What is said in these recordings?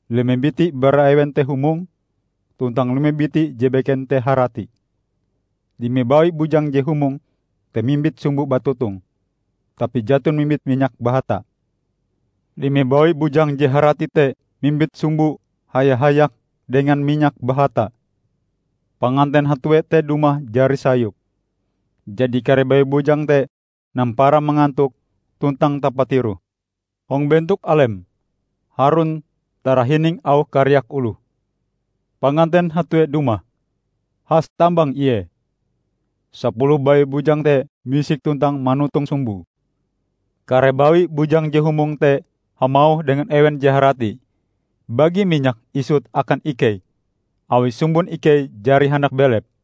Lime biti bara ewen te humong, tuntang lime biti je beken te harati. Lime bawi bujang je humong te mimbit sumbo batotong, tapi jaton mimbit minyak bahatae. Lime bawi bujang je harati te mimbit sumboe haya-hayak dengan minyak bahatae. Panganten hatue te dumah jari sayup, jadi kare bawi bujang te nampara mangantok tuntang tapatiroh. Hong bentok alem, harun tarahining auh kariak oloh, 'Panganten hatue dumah! Has tambang ie!' Sapuluh bawi bujang te misik tuntang manotong sumboe. Kare bawi bujang je humong te hamauh dengan ewen je harati, 'Bagi minyakm isut akan ikei, awi sumbon ikei jari handak belep.'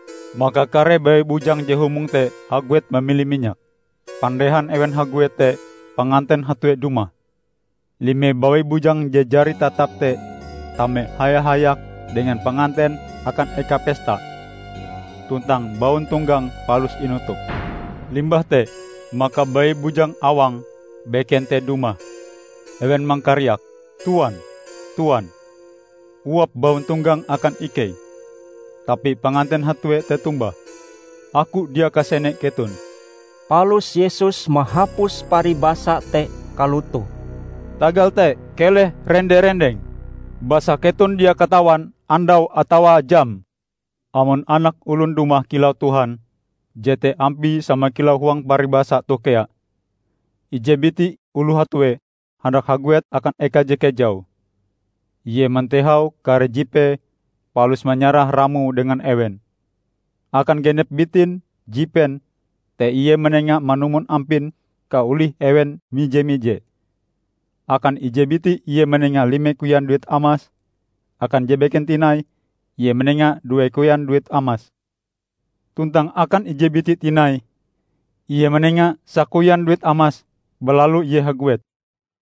Maka kare bawi bujang je humong te haguet mamili minyak. Pandehan ewen haguet, te panganten hatue dumah. Lime bawi bujang je jari tatap te tame haya-hayak dengan panganten akan eka pesta, tuntang bauntonggang palus inutup! Limbah te, maka bawi bujang awang beken te dumah. Ewen mangkariak, 'Tuan, Tuan, uap bauntonggang akan ikei.' Tapi panganten hatue te tombah, 'Aku dia kasene keton!' " Palus Yesus mahapus paribasa te kalotoh, "Tagal te keleh rende-rendeng, basa keton dia katawan andaue atawa jame." "Amon Anak Olon dumah kilau Tuhan, jete ampie sama kilau huang paribasa toh kea. Ije biti oloh hatue handak haguet akan eka je kejau. Ie mantehau kare jipee palus manyarah ramoe dengan ewen. Akan genep bitin jipen te ie manenga manumon ampin kaolih ewen mije-mije. Akan ije biti ie manenga lime koyan duit amas. Akan je beken tinai ie manenga due koyan duit amas. Tuntang akan ije biti tinai ie manenga sakoyan duit amas. Balalu ie haguet.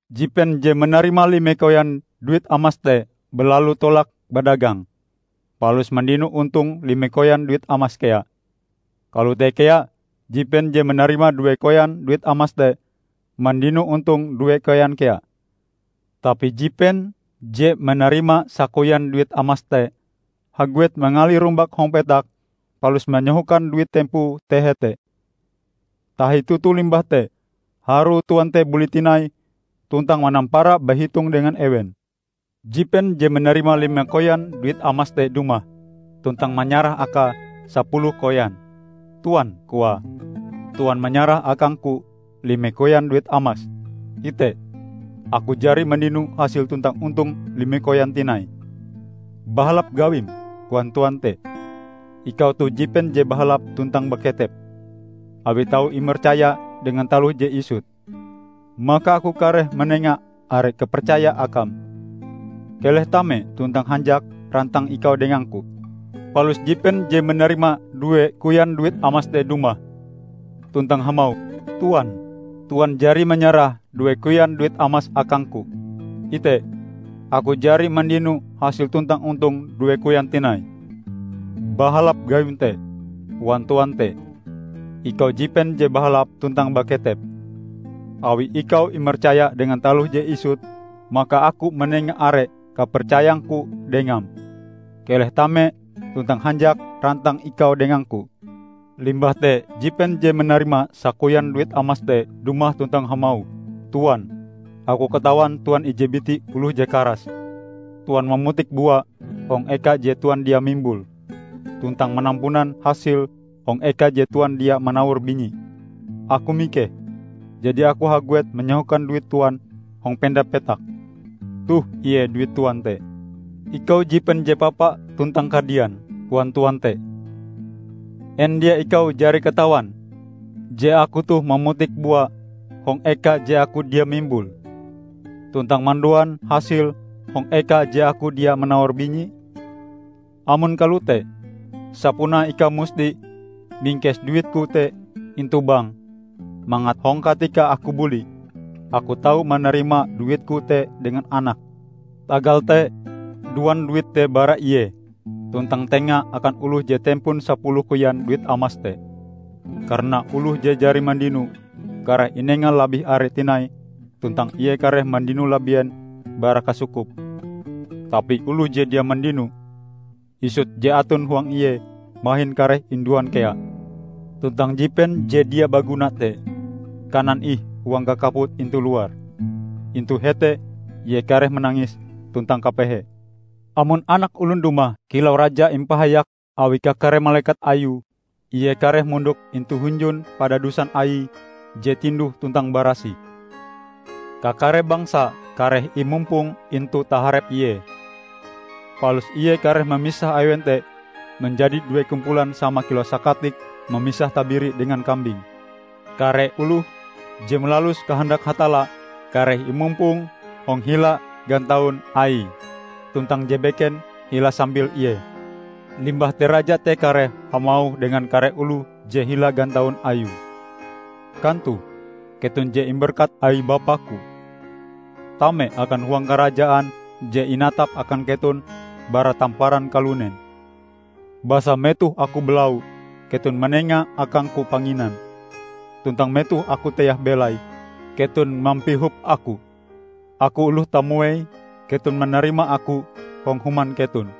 Jipen je manarima lime koyan duit amas te balalu tolak badagang, palus mandino ontong lime koyan duit amas kea. Kalote kea jipen je manarima due koyan duit amas te mandino ontong due koyan kea. Tapi jipen je manarima sakoyan duit amas te haguet mangali rumbak hong petak, palus manyahokan duit tempoe te hete. Tahi toto limbah te, harue tuan te buli tinai, tuntang manampara bahitong dengan ewen. Jipen je manarima lime koyan duit amas te dumah, tuntang manyarah akae sapuluh koyan. 'Tuan,' koae, 'Tuan manyarah akangku lime koyan duit amas. Ite, aku jari mandino hasil tuntang ontong lime koyan tinai.' 'Bahalap gawim,' koan tuan te, 'Ikau toh jipen je bahalap tuntang baketep. Awi tau imercaya dengan taloh je isut, maka Aku kareh manenga are kapercaya akam. Keleh tame tuntang hanjak rantang ikau dengangku!' Palus jipen je manarima due koyan duit amas te dumah, tuntang hamauh, 'Tuan, Tuan jari manyarah due koyan duit amas akangku. Ite, aku jari mandino hasil tuntang ontong due koyan tinai.' 'Bahalap gawim te,' koan tuan te, 'ikau jipen je bahalap tuntang baketep. Awi ikau imercaya dengan taloh je isut, maka Aku manenga are kapercayang-Ku dengam. Keleh tame tuntang hanjak rantang ikau dengang-Ku!' Limbah te jipen je manarima sakoyan duit amas te dumah tuntang hamauh, 'Tuan, aku katawan tuan ije biti oloh je karas. Tuan mamutik bua hong eka je tuan dia mimbule, tuntang manampunan hasil hong eka je tuan dia manawor binyie. Aku mikeh, jadi aku haguet manyahokan duit tuan hong penda petak. Toh ie duit tuan te.' 'Ikau jipen je papa tuntang kadian!' koan tuan te. 'En dia ikau jari katawan je Aku toh mamutik bua hong eka je aku dia mimbule, tuntang manduan hasil hong eka je aku dia manawor binyie? Amon kalote, sapunae ikau musti mingkes duitku te intu bank, mangat hong katika aku buli, aku tau manarima duitku te dengan anake. Tagal te, duan duit te bara ie, tuntang tenga akan oloh je tempon sapuluh koyan duit amas te. Karana oloh je jari mandino, kareh inenga labih are tinai tuntang ie kareh mandino labien bara kasukupe. Tapi oloh je dia mandino, isut je aton huang ie mahin kareh induan kea. Tuntang jipen je dia baguna te, kanan ih huang kakaput intu luar. Intu hete ie kareh manangis tuntang kapehe!' " "Amon Anak Olon dumah kilau Raja impahayak awi kakare malekat Ayue, Ie kareh mondok intu hunjun padadusan Aie je tinduh tuntang barasih. Kakare bangsa kareh imumpong intu taharep Ie. Palus Ie kareh mamisah ewen te manjadi due kumpulan sama kilau sakatik mamisah tabiri dengan kambing. Kare oloh je malalus kahandak Hatalla kareh imumpong hong hila gantaun Aie, tuntang je beken hila sambil Ie. Limbah te Raja te kareh hamauh dengan kare oloh je hila gantaun Ayue, 'Kantoh keton je imberkat awi Bapa-Ku. Tame akan huang Karajaan je inatap akan keton bara tamparan kalunen. Basa metoh Aku balau, keton manenga akang-Ku panginan, tuntang metoh Aku teah belai, keton mampihop Aku. Aku oloh tamuei, keton manarima Aku hong human keton.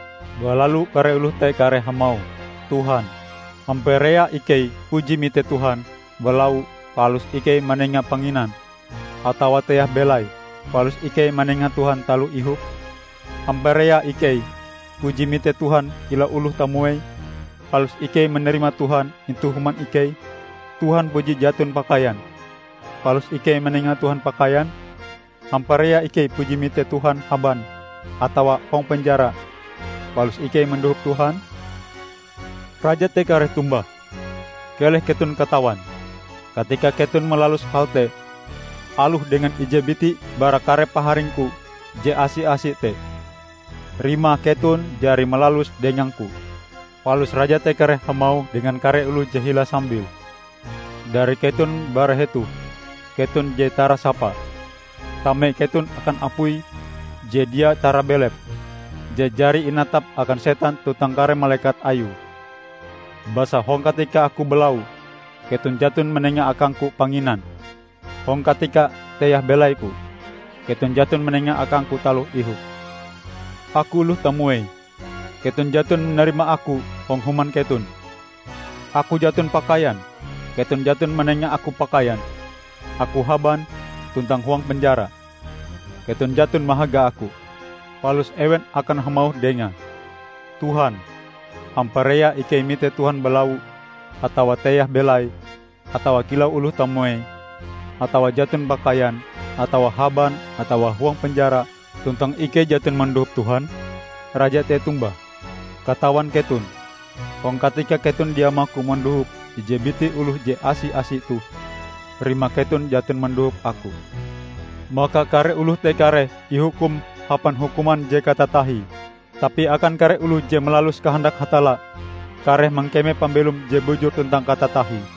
Balalu kare oloh te kareh hamauh, 'Tuhan, hamparea ikei puji mite Tuhan balau palus ikei manenga panginan, atawa teah belai palus ikei manenga Tuhan taloh ihop? Hamparea ikei puji mite Tuhan kilau oloh tamuei, palus ikei manarima Tuhan intu human ikei? Tuhan puji jaton pakaian, palus ikei manenga Tuhan pakaian? Hamparea ikei puji mite Tuhan haban atawa hong penjara, palus ikei mandohop Tuhan?' Raja te kareh tombah, 'Keleh keton katawan: katika keton malalus hal te, aloh dengan ije biti bara kare paharing-Ku je asi-asi te, rimae keton jari malaluse dengang-Ku!' Palus Raja te kareh hamauh dengan kare oloh je hila sambile, 'Dari keton bara hetoh, keton je tarasapa! Tame keton akan apui je dia tarabelep, je jari inatap akan Setan tuntang kare malekat ayue! Basa hong katika Aku balau, keton jaton manenga akang-Ku panginan; hong katika teah belai-Ku, keton jaton manenga akang-Ku taloh ihop. Aku oloh tamuei, keton jaton manarima Aku hong human keton. Aku jaton pakaian, keton jaton manenga Aku pakaian. Aku haban tuntang huang penjara, keton jaton mahaga Aku.' Palus ewen akan hamauh Dengae, 'Tuhan, hamparea ikei mite Tuhan balau, atawa teah belai, atawa kilau oloh tamuei, atawa jaton pakaian, atawa haban atawa huang penjara, tuntang ikei jaton mandohop Tuhan?' Raja te tombah, 'Katawan keton: hong katika keton dia maku mandohop ije biti oloh je asi-asi toh, rimae keton jaton mandohop Aku.' Maka kare oloh te kareh ihukum hapan hukuman je katatahie, tapi akan kare oloh je malalus kahandak Hatalla kareh mangkeme pambelom je bujur tuntang katatahie."